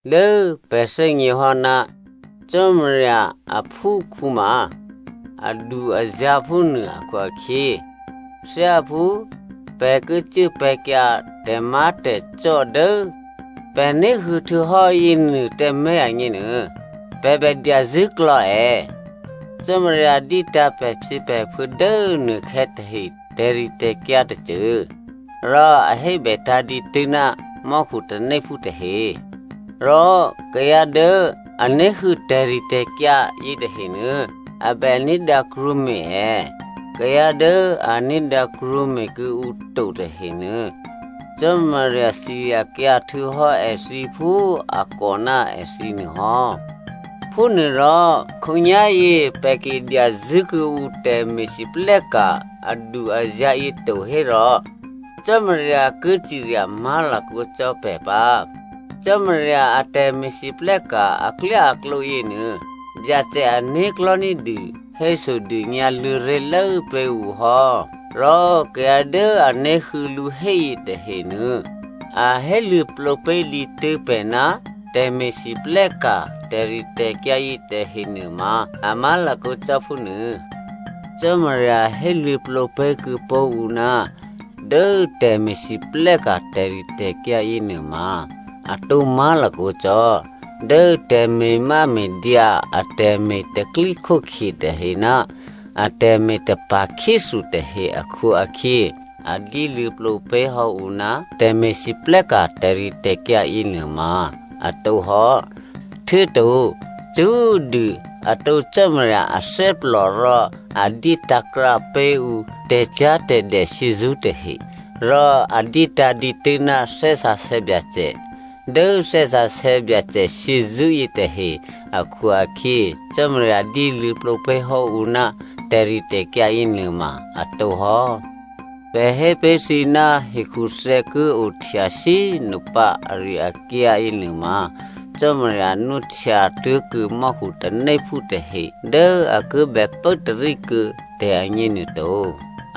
Dố pè̤ thè́gněhò́ ná Cò́marya aphúkhǔ ma adu-azǎ̤ phúnuô akhu-akhyě, thyáphú pè̤ ki cuốpè̤̌kyǎ tè̤má̤tè̤cò́ dố pè̤ ní̤huô̌ htuô̌hò́ yěnuô tǎmé̤ agněnuô, pè̤ bè dyazṳ̂́klò̌ è. Cò́marya dyétǎ̤ pè̤phyěpè̤phuô̌ dố nuôkhè̌ tahe tè̤ritè̤kyǎ tôcô. Rò a hébètǎ̤ dǐtû́ ná mò́khu tanéphú tahe. Rò kayǎ dố a ní̤huô̌ tè̤ritè̤kyǎ yětahenuô, a bè ní̤dǎ krwǒme̤ è. Kayǎ dố a ní̤dǎ krwǒme̤ kuô̌ǔ to tahenuô, Cò́marya ciryakyǎ htuô̌hò́ èthǐ phú a kò ná èthǐ nuôhò́. Phúnuôrò, khǒnyá̤yě pè̤ ki dyazṳ̂́ kuô̌ǔ tè̤me̤lwóhteka̤ adu-azǎ̤ yě to hérò Cò́marya ki cirya má̤lakǒ cò́ pè̤ pǎ. Cò́marya a tè̤me̤lwóhteka̤ aklyáaklǒ yěnuô, Byacè ané̤klò̤́ ní̤dû hésodônyǎ luô̌ ré̤lố pé̤ ǔ hò́. Rò kayǎ dố a ní̤huô̌ lǔ héyě tahenuô a héluô̌plǒ pé̤ dǐtû́ pè̤ ná tè̤me̤lwóhteka̤ tè̤ritè̤kyǎ yětahe nuôma a má̤lakǒ cò́ phúnuô. Cò́marya héluô̌plǒ pé̤kuô̌pó̤ ǔ ná dố tè̤me̤lwóhteka̤ tè̤ritè̤kyǎ yěnuôma atǒ má̤lakǒ cò́. Dố tè̤me̤máme̤dyǎ, atè̤me̤ tè̤pro̤tè̤prya̤ tahe ná atè̤me̤ tapa̤khyéthu tahe akhu-akhyě, a dyéluô̌plǒ pé̤hò́ ǔ ná tè̤me̤lwóhteka̤ tè̤ritè̤kyǎ yěnuôma a tǒhò́. Htuô̌to, cṳ́꤮ dû atǒ Cò́marya athè́plò rò a dyétǎ̤ krǎ pé̤ ǔ tè̤cyá̤tè̤dè shyězṳ́ tahe. Rò a dyétǎ̤ dǐtû́ ná Thè́ Sǎsè̌ Byacè. Dố Thè́ Sǎsè̌ Byacè shyězṳ́yě tahe akhu-akhyě, Cò́marya dyéluô̌plǒ pé̤hò́ǔ ná tè̤ritè̤kyǎ yěnuôma a tǒhò́. Pè̤ hé pé̤ thǐ ná hekhuthè̌ ki ohtya shyé꤮ nopǎ ari-akyǎyě nuôma, Cò́marya nwóhtya tố̤kuô̌ mò́khu tanéphú tahe dố a ki bè pốtarí kuô̌ tè̤agně nuôto.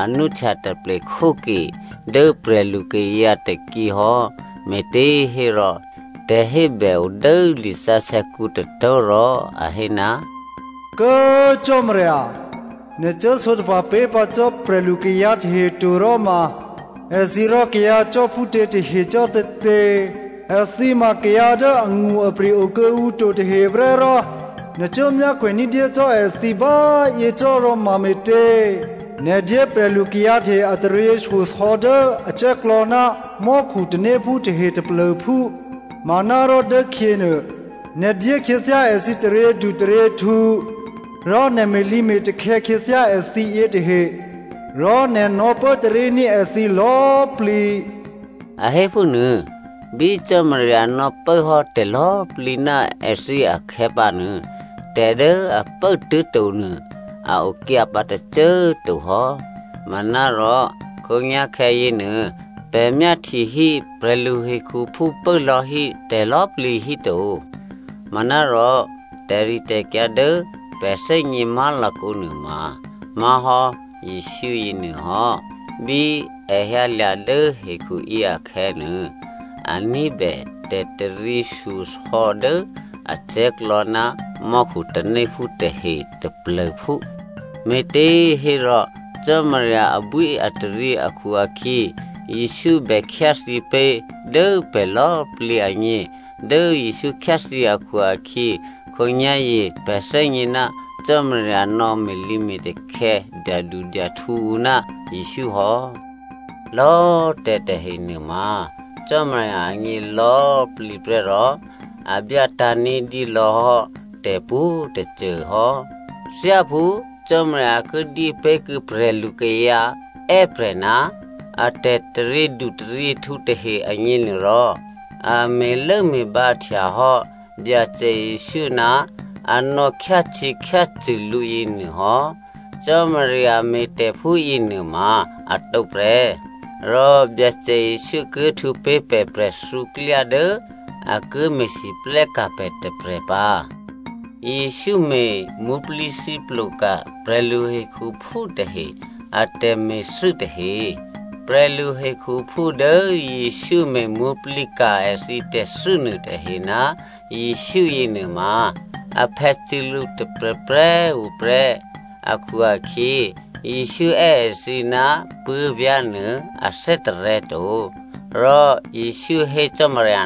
A nwóhtya taple khóke dố prè̤lukayǎ tôkyěhò́, me̤těhérò tè̤hébè odố lisǎsè̌kǔ tôtó̤ rò a hé, “Kố꤮ Cò́marya, nè̤ cuố sǒtapa̤ pé̤pǎ cò́ prè̤lukayǎ tahe to ròma, èthǐ rò kayǎcò́ phútě tahe cò́tětě? Èthǐ ma kayǎ dố angṳ-apri̤ okuô̌ǔ to taheprè́ rò nè̤ cuố myákhwè ní̤dyé cò́ èthǐ bá꤮ yěcò́ ròmame̤tě? Nè̤ dyé prè̤lukayǎ tahe a taryěshyosò̌ dố acè̤́klò̌ ná mò́khu tanéphú tahe taplô̤phú manárò dốkhyě nuô, nè̤ dyé khyěthyá èthǐ taryědutaryěhtǔ, rò nè̤ me̤lǐme̤takhè̌ khyěthyá èthǐ yětahe, rò nè̤ nò̌pốtaríní̤ èthǐ lò̌꤮ plǐ,” a hé phúnuô. Bí Cò́marya nò̌pốhò́ tè̤lò̌꤮ plǐ ná èthǐ akhè̌pǎnuô, tè̤dố a pốtố̤to nuô a o kyǎ pǎ tôcô꤮ to hò́. Manárò khǒnyá̤khè̌ yěnuô pè̤ myáhtyehí prè̤lu hekhuphú pốlò̌hí tè̤lò̌꤮ plǐ híto. Manárò, tè̤ritè̤kyǎ dố pè̤ thè́gně má̤lakǒ nuôma má̤hò́ Jesǔ yěnuôhò́. Bí è hyǎlya̤ dố hekhuyě akhè̌nuô, a ní̤bè tè̤taryěshyosò̌ dố acè̤́klò̌ ná mò́khu tanéphú tahe taplô̤phú, me̤těhérò, dố Cò́marya abwíataryě akhu-akhyě, Jesǔ bè khyáthyě pé̤ dố pè̤ lò̌꤮ plǐ agně. Dố Jesǔ khyáthyě akhu-akhyě, khǒnyá̤yě pè̤ thè́gně ná Cò́marya nò̌ me̤lǐme̤takhè̌, dyadudyahtǔ ǔ ná Jesǔ hò́. Lò̌꤮ tè̤tahe nuôma Cò́marya agně lò̌꤮ plǐ prè́ rò a byátǎ̤ ní̤dyé lò̌hò́ tè̤ pwǒ̤꤮ tôcô hò́. Thyáphú Cò́marya ki dyé pé̤kuô̌ prè̤lu kayǎ è́prè̤ ná a tè̤taryědu taryěhtǔ tahe agněnuôrò, a me̤lốme̤bǎhtya hò́ Byacè Jesǔ ná a nò̌ khyácyě̤khyácṳ̂ lǔ yěnuô hò́. Cò́marya me̤ tè̤ phúyě nuôma atǒ prè́. Rò Byacè Jesǔ ki htwǒ pé̤ pè̤ prè̤thǔ klyá dố a ki me̤lwóhteka̤ pè̤ tôprè̤ pǎ. Jesǔ me̤ mwǒ̤plǐthǐplo ka̤ prè̤luhekhuphú tahe a tè̤me̤thû́ tahe. Prè̤luhekhuphú dố Jesǔ me̤ mwǒ̤plǐka̤ èthǐtè̤thû́ nuôtahe ná Jesǔ yěnuôma, aphè̌ cû̌lǔ tôprè̤prè̤꤮ tuô̌ prè́ akhu-akhyě, Jesǔ è́ èthǐ ná puố̤vyá̤ nuô a thè́tarè̤̌ to. Rò Jesǔ hé Cò́marya,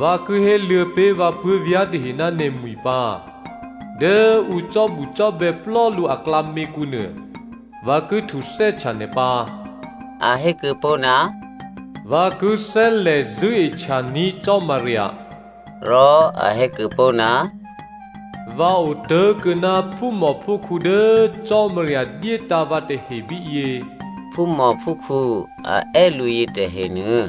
“Vǎ ki héluô̌ pé̤ vǎ puố̤vyá̤ tahe ná nè̤mwi̤ pǎ. Dố ǔ cò́bucò́bè̌ plò́ lǔ aklǎměkǔ nuô, vǎ ki htuthè́htya nè̤ pǎ.” A hé kuô̌pó̤, “Vǎ ki thè́lè̤ zṳ̂́ehtyaní̤ Cò́marya.” Rò a hé kuô̌pó̤, “Vǎ otố̤kuô̌ ná phúmòphúkhǔ dố Cò́marya dyétǎ̤ vǎ tahe bíyě.” Phúmòphúkhǔ a è́ lǔ yětahenuô,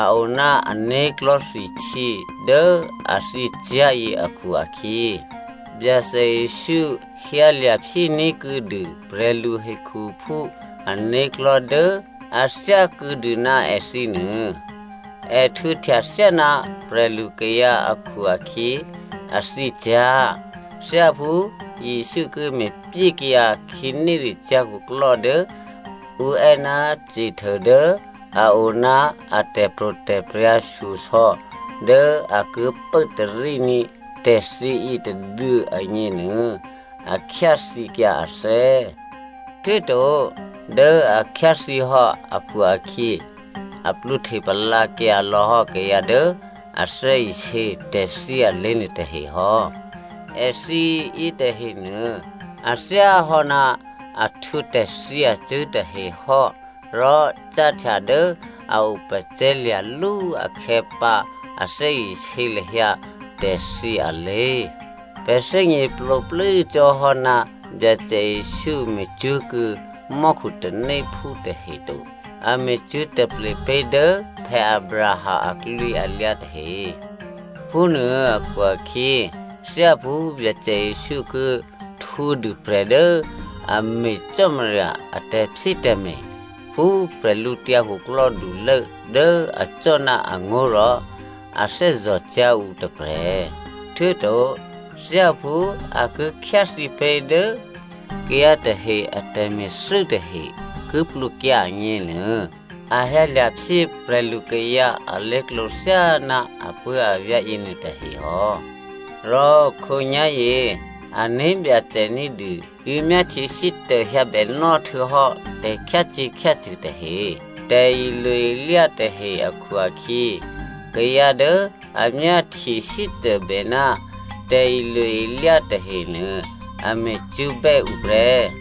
a o ná ané̤klò̤́ thwihtyě dố a thyěcyá̤yě akhu-akhyě, Byacè Jesǔ hyǎlya̤ phyéní̤ kuô̌dû prè̤lu hekhuphú ané̤klò̤́ dố a thyákuô̌ dû ná èthǐnuô. È htwǒhtya thyáná prè̤lukayǎ akhu-akhyě, a thyě cyá̤. Thyáphú Jesǔ ki me̤pyékyǎ khǐnéricyá̤ khuklò́ dố ǔ è́ ná Satan dố a o ná a tè̤pro̤tè̤prya̤ shyosò̌ dố a ki pốtaríní̤ tè̤thyě yětôduô̌ agněnuô, a khyáthyěkyǎ athè́. Htuô̌to dố a khyáthyě hò́ akhu-akhyě a plwǒhte palǎkyǎ lò̌hò́ kayǎ dố a thè́isě tè̤thyě alé̤ nuôtahe hò́. Èthǐ yětahenuô a thyáhò́ ná a htwǒ tè̤thyě acṳ̂́ tahe hò́, rò cáhtya dố a opacè̤̌lya̤lú akhè̌pǎ a thè́isě lahyǎ tè̤thyě alé̤. Pè̤ thè́gněplǒplû́ cò́ hò́ ná Byacè Jesǔ me̤cwó̤kuô̌ mò́khu tanéphú tahe to. A me̤cwó̤ taple pé̤ dố Abraham aklwǐalyǎ tahe. Phúnuô akhu-akhyě thyáphú Byacè Jesǔ ki htwǒdû prè̤ dố a me̤ Cò́marya a tè̤phyétè̤me̤ phú bwídukhulố dố acò́ ná angó̤ rò a thè́zò̤cyá̤ ǔ tôprè̤, htuô̌to thyáphú a ki khyáthyěpé̤ dố kayǎ tahe a tè̤me̤thû́ tahe ki plwǒkyǎ agněnuô, a hyǎlya̤ phyé prè̤lukayǎ alé̤klǒ thyáná apuố̤avyá̤ yěnuôtahe hò́. Rò khǒnyá̤yě, ané̤ Byacè ní̤dû yǒ myáhtyesítô hyǎ bènò́ htuô̌hò́ tè̤khyácyě̤khyácṳ̂ tahe, tè̤ilo-ilyá tahe akhu-akhyě kayǎ dố a myáhtye sítôbè ná tè̤ilo-ilyá tahenuô a me̤cwó̤bè́ ǔ prè́.